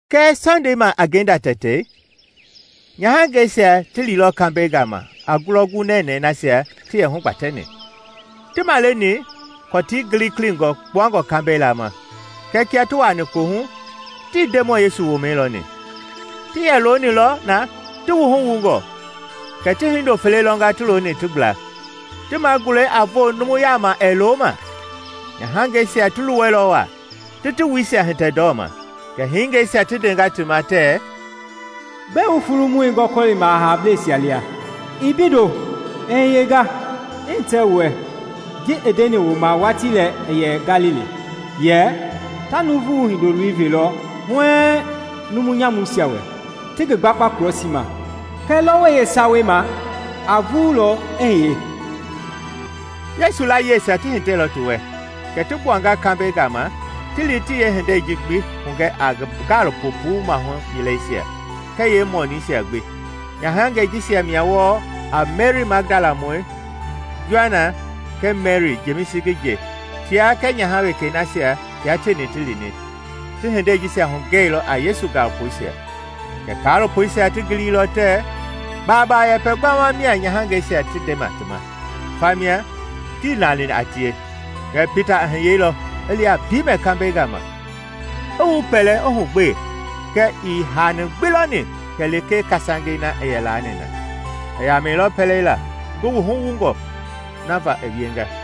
Kɛɛ Sɔndei ma a ngenda tɛtei, nyahangɛisia ti liilɔ kambɛi gama a ngulɔ gunɛnɛi nasia ti yɛ hugbatɛni. Ti maleni kɔtii gilikilingɔ kpuangɔ kambɛi lama, kɛɛ kia ti wuani kohu tii Ndemɔi Yesu womɛi lɔni. Ti yɛ loonilɔ na, ti wuhu wungɔ, kɛ ti hindo fele lɔnga ti looni ti gbla, ti magulɛi a voo numu yama ɛɛ lo ma. Nyahangɛisia ti luwɛilɔ wa, ti ti wuisia hitɛ ndɔma, kɛ hingɛisia ti ndenga ti ma tɛɛ, “Gbɛe wu fulumɔi gɔkɔlima hablɛisia lia? II mbeindo; i hiyenga. I hitɛ wu wɛ ji i ndeni wu ma watii lɛ i yɛ Galili, yɛ, ‘Ta Nuuvu Hindoloi velɔ huɛɛŋ numu nyamuisia wɛ, ti ngi gbakpa krɔsii ma, kɛɛ lɔwɔi yeesawei ma a vululɔ i hiye.’” Yesu layiesia ti hitɛilɔ ti wɛ, kɛ ti gbuanga kambɛi gama ti li ti yeehindei ji gbi hugɛ a ngi gaalopo puu mahu yileisia kɛɛ yeemɔniisia gbi. Nyahangɛi jisia mia wɔɔ a Meri Magdalamɔi, Joana kɛɛ Meri, Jemisi ngi nje; tia kɛɛ nyaha wekei nasia tia tieni ti lini, ti hindei jisia hugɛilɔ a Yesu gaalopoisia. Kɛɛ kaalopoisia ti giliilɔ tɛɛ baaba yɛpɛ gbama mia nyahangɛi jisia ti ndema ti ma, fa mia tii lani a tie. Kɛɛ Pita i hiyeilɔ i li a piimɛ kambɛi gama, i wupɛlɛ, i hugbee kɛɛ ii hani gbi lɔni kɛ lekee kasangei na i yɛ laani na. I yamɛilɔ pɛleila, ngi wuhu wungɔ na va i wienga.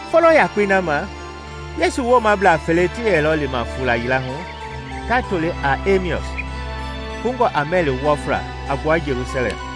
Folo yakpei na ma Yesu woomablaa fele ti yɛlɔ lima fuula yila hu ta toli a Ɛmeɔs, kungɔ a mɛli wɔfla a gbua Jelusalɛm,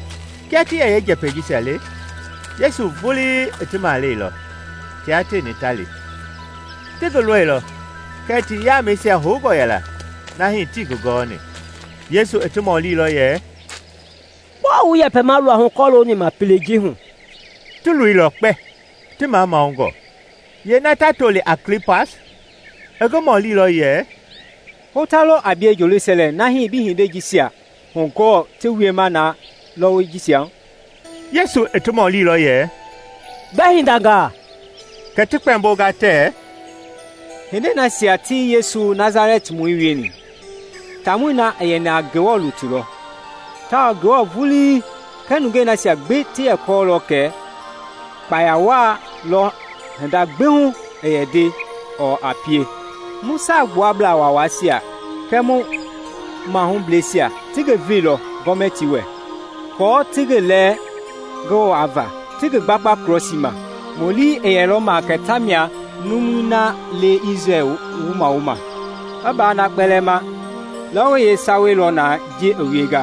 Kia ti yɛ yeenjɛpɛi jisia le, Yesu vulii i ti maleilɔ, tia tieni ta li. Ti ngi lɔilɔ kɛɛ ti yamɛisia houngɔ yɛla na hii tii ngi gɔni. Yesu i ti mɔlilɔ yɛ, “Gbɔɔ wu yɛpɛma luahu kɔlooni ma pelei ji hu?” Ti loilɔ kpɛ, ti mamanungɔ. Yeena ta toli a Kliopas i ngi mɔlilɔ yɛ, “Hota lɔ a bie Jelusalɛm na hii bii hindei jisia hugɔɔ ti wiema na lɔwɔi jisia hu?” Yesu i ti mɔlilɔ yɛ, “Gbɛ hindangaa?” Kɛ ti kpɛmbonga tɛɛ, “Hindei nasia ti Yesu Nasalɛtimɔi wieni. Taamɔi na i yɛni a Ngewɔ lutui lɔ tawao Ngewɔ vulii kɛɛ nungeisia gbi ti yɛ kɔɔlɔ kɛ kpaya waa lɔ hinda gbi hu a nde ɔɔ a pie. Mu Saagbuablaa Waawaisia kɛɛ mu mahubleisia ti ngi veilɔ Gɔmɛtii wɛ aako ti ngi lɛɛ ngi wava, ti ngi gbakpa krɔsii ma. Mu lii i yɛlɔ ma kɛ ta mia numui na le a Isrɛl wumawo. I ba na kpɛlɛɛ ma, lɔwɔi yeesawei lɔ na ji i wienga.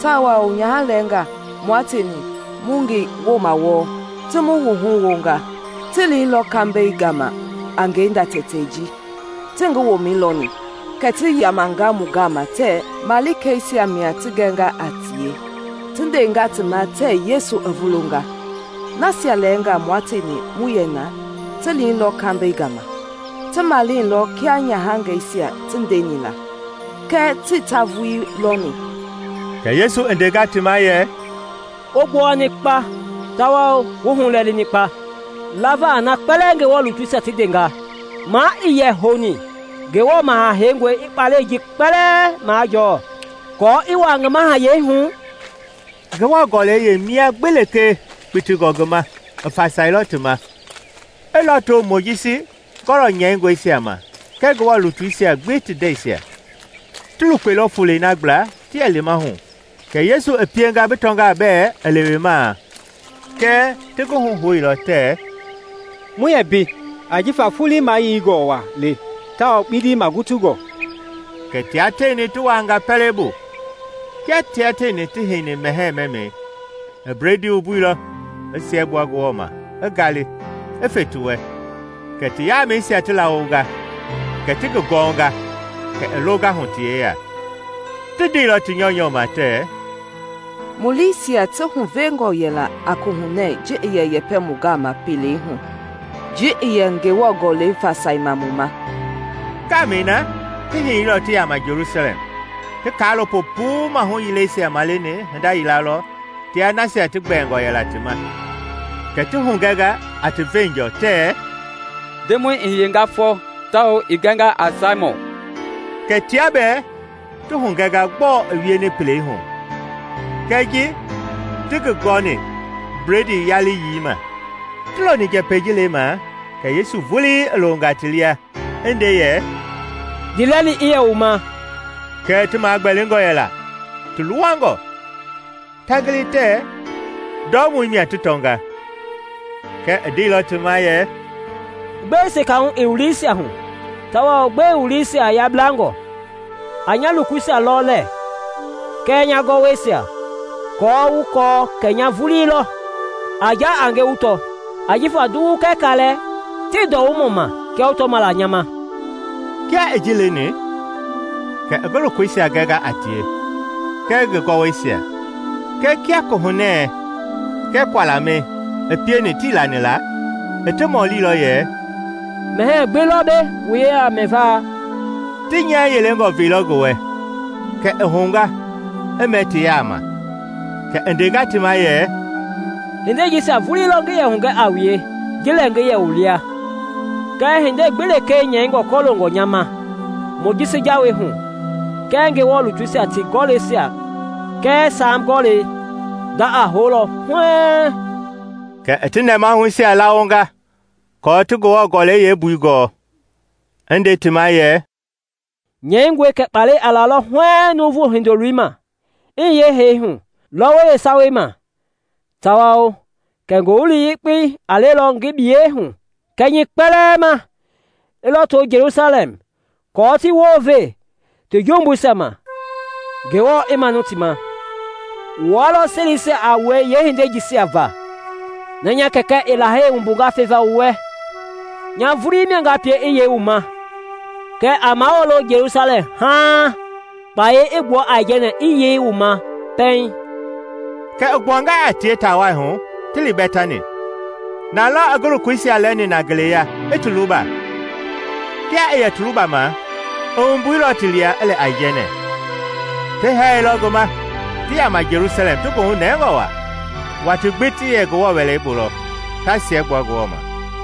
Tawao nyaha lɛɛnga mua tieni mu ngi woma wɔɔ, ti mu wuhu wunga. Ti liilɔ kambɛi gama a ngenda tɛtei ji tii ngi womɛi lɔni; kɛ ti yamanga mu gama tɛɛ malikeisia mia ti gɛnga a tie ti ndenga ti ma tɛɛ Yesu i vulunga. Nasia lɛɛnga mua tieni mu yɛ na ti liilɔ kambɛi gama, ti male lɔɔ kia nyahangɛisia ti ndeni la; kɛɛ tii ta vulii lɔni.” Kɛ Yesu i ndenga ti ma yɛ, “Wu gbowani kpa tawao wu hulɛlini kpa lava a na kpɛlɛɛ Ngewɔ lutuisia ti ndenga! Ma ii yɛ houni Ngewɔ Maha Heingɔi i kpalɛi ji kpɛlɛɛ majɔɔ aako i wua ngi mahayɛi hu?” Ngewɔ Gɔlɛi yeemia gbi lekee kpitingɔ ngi ma, i fasailɔ ti ma, i lɔto Mojisi gɔlɔ nyɛingɔisia ma kɛɛ Ngewɔ lutuisia gbi ti ndɛisia. Ti lukpeilɔ fulei na gbla ti yɛ lima hu kɛ Yesu i pienga bi tɔngaa bɛɛ i lewemaa; kɛɛ ti ngi huhouilɔ tɛɛ, “Mu yii mbei ajifa foloi yeingɔ wa le tawao kpindi magutungɔ.” Kɛ tia tieni ti wuanga pɛlei bu. Kia tia tieni ti heini mɛhɛɛ mɛmɛi, i bledii wumbuilɔ, i siɛgbua Ngewɔ ma, i ngali, i fe ti wɛ. Kɛ ti yamɛisia ti lawonga, kɛ ti ngi gɔnga, kɛ i longa hu ti yeya. Ti ndeilɔ ti nyɔunyɔ ma tɛɛ, “Mu liisia tii huvengɔ yɛla a kohunɛ ji i yɛ yɛpɛ mu gama pelei hu kɛɛ ji i yɛ Ngewɔ Gɔlɛi fasaima mu ma?” Ngamɛi na ti hiyeilɔ ti yama Jelusalɛm. Ti kaalopo puu mahu yileisia maleni hinda yila lɔ tia nasia ti gbɛɛngɔ yɛla ti ma, kɛ ti hugɛnga a ti veenjɔ tɛɛ, “Ndemɔi i hiyenga fɔ, tawao i gɛnga a Saimɔn!” Kɛ tia bɛɛ ti hugɛnga gbɔɔ i wieni pelei hu kɛɛ ji ti ngi gɔni bledii yaliyii ma. Ti loni njɛpɛi ji lemaa kɛ Yesu vulii i longa ti lia, i nde yɛ, “Ndiilɛli i yɛ wu ma!” Kɛɛ ti magbɛlingɔ yɛla, ti luwangɔ, ta gili tɛɛ ndɔumɔi mia ti tɔnga. Kɛɛ i ndeilɔ ti ma yɛ, “Gbɛe sekahu i wu liisia hu tawao gbɛe wu liisia yablangɔ? A nya lokoisia lɔ lɛɛ kɛɛ nya gɔwɔisia, aako wu kɔɔ kɛ nya vulii lɔ; a ja a nge, wu tɔ; ajifa nduwu kɛɛ kaalɛ tii ndɔumɔ ma kia wu tɔma la nya ma.” Kia i ji leni kɛ i ngi lokoisia gɛnga a tie kɛɛ ngi gɔwɔisia. Kɛɛ kia Kohunɛ kɛɛ kualamɛi i pieni tii lani la, i ti mɔlilɔ yɛ, “Mɛhɛɛ gbi lɔ mbei wu yeya mɛva?” Ti nyɛɛ yeelengɔ veilɔ ngi wɛ, kɛ i hounga i mɛ ti yama. Kɛ i ndenga ti ma yɛ, “Hindei jisia vulii lɔ ngi yɛ hugɛ a wue ji lɛ ngi yɛ wu lia ngɛɛ hindei gbi lekee nyɛingɔ kɔloongɔ nya ma Mojisi jawei hu kɛɛ Ngewɔ lutuisia ti gɔlɛisia kɛɛ Saam Gɔlɛi, nda a houlɔ huɛɛŋ.” Kɛ i ti nɛmahuisia lawonga aako ti Ngewɔ Gɔlɛi yeembui gɔɔ, i nde ti ma yɛ, “Nyɛingɔe kɛ kpalɛ a lalɔ huɛɛŋ Nuuvu Hindoloi ma, i hiye hee hu lɔwɔi yeesawei ma, tawao kɛ Ngowili Yekpei a lelɔ ngi biyei hu kɛnyɛi kpɛlɛɛ ma i lɔto Jelusalɛm aako ti wounve ti jumbuisia ma Ngewɔ i manu ti ma. Wua lɔ selisia a wue yeehindei jisia va. Na nya Kɛkɛ i lahei wumbunga feva wu wɛ, nya vulii mia nga pie i yei wu ma; kɛɛ a mawulo Jelusalɛm haaŋ kpayei i gbua aijɛnɛ i yei wu ma pɛiŋ.” Kɛ i gbuanga a tie ta wai hu ti li Bɛtani. Na lɔ i ngi lokoisia lɛni na ngeleya i ti luba. Kia i yɛ ti lubama, i wumbuilɔ ti lia, i lɛ aijɛnɛ. Ti hɛɛilɔ ngi ma, ti yama Jelusalɛm ti goohu nɛngɔ wa. Watii gbi ti yɛ Ngewɔ Wɛlei bu lɔ ta siɛgbua Ngewɔ ma.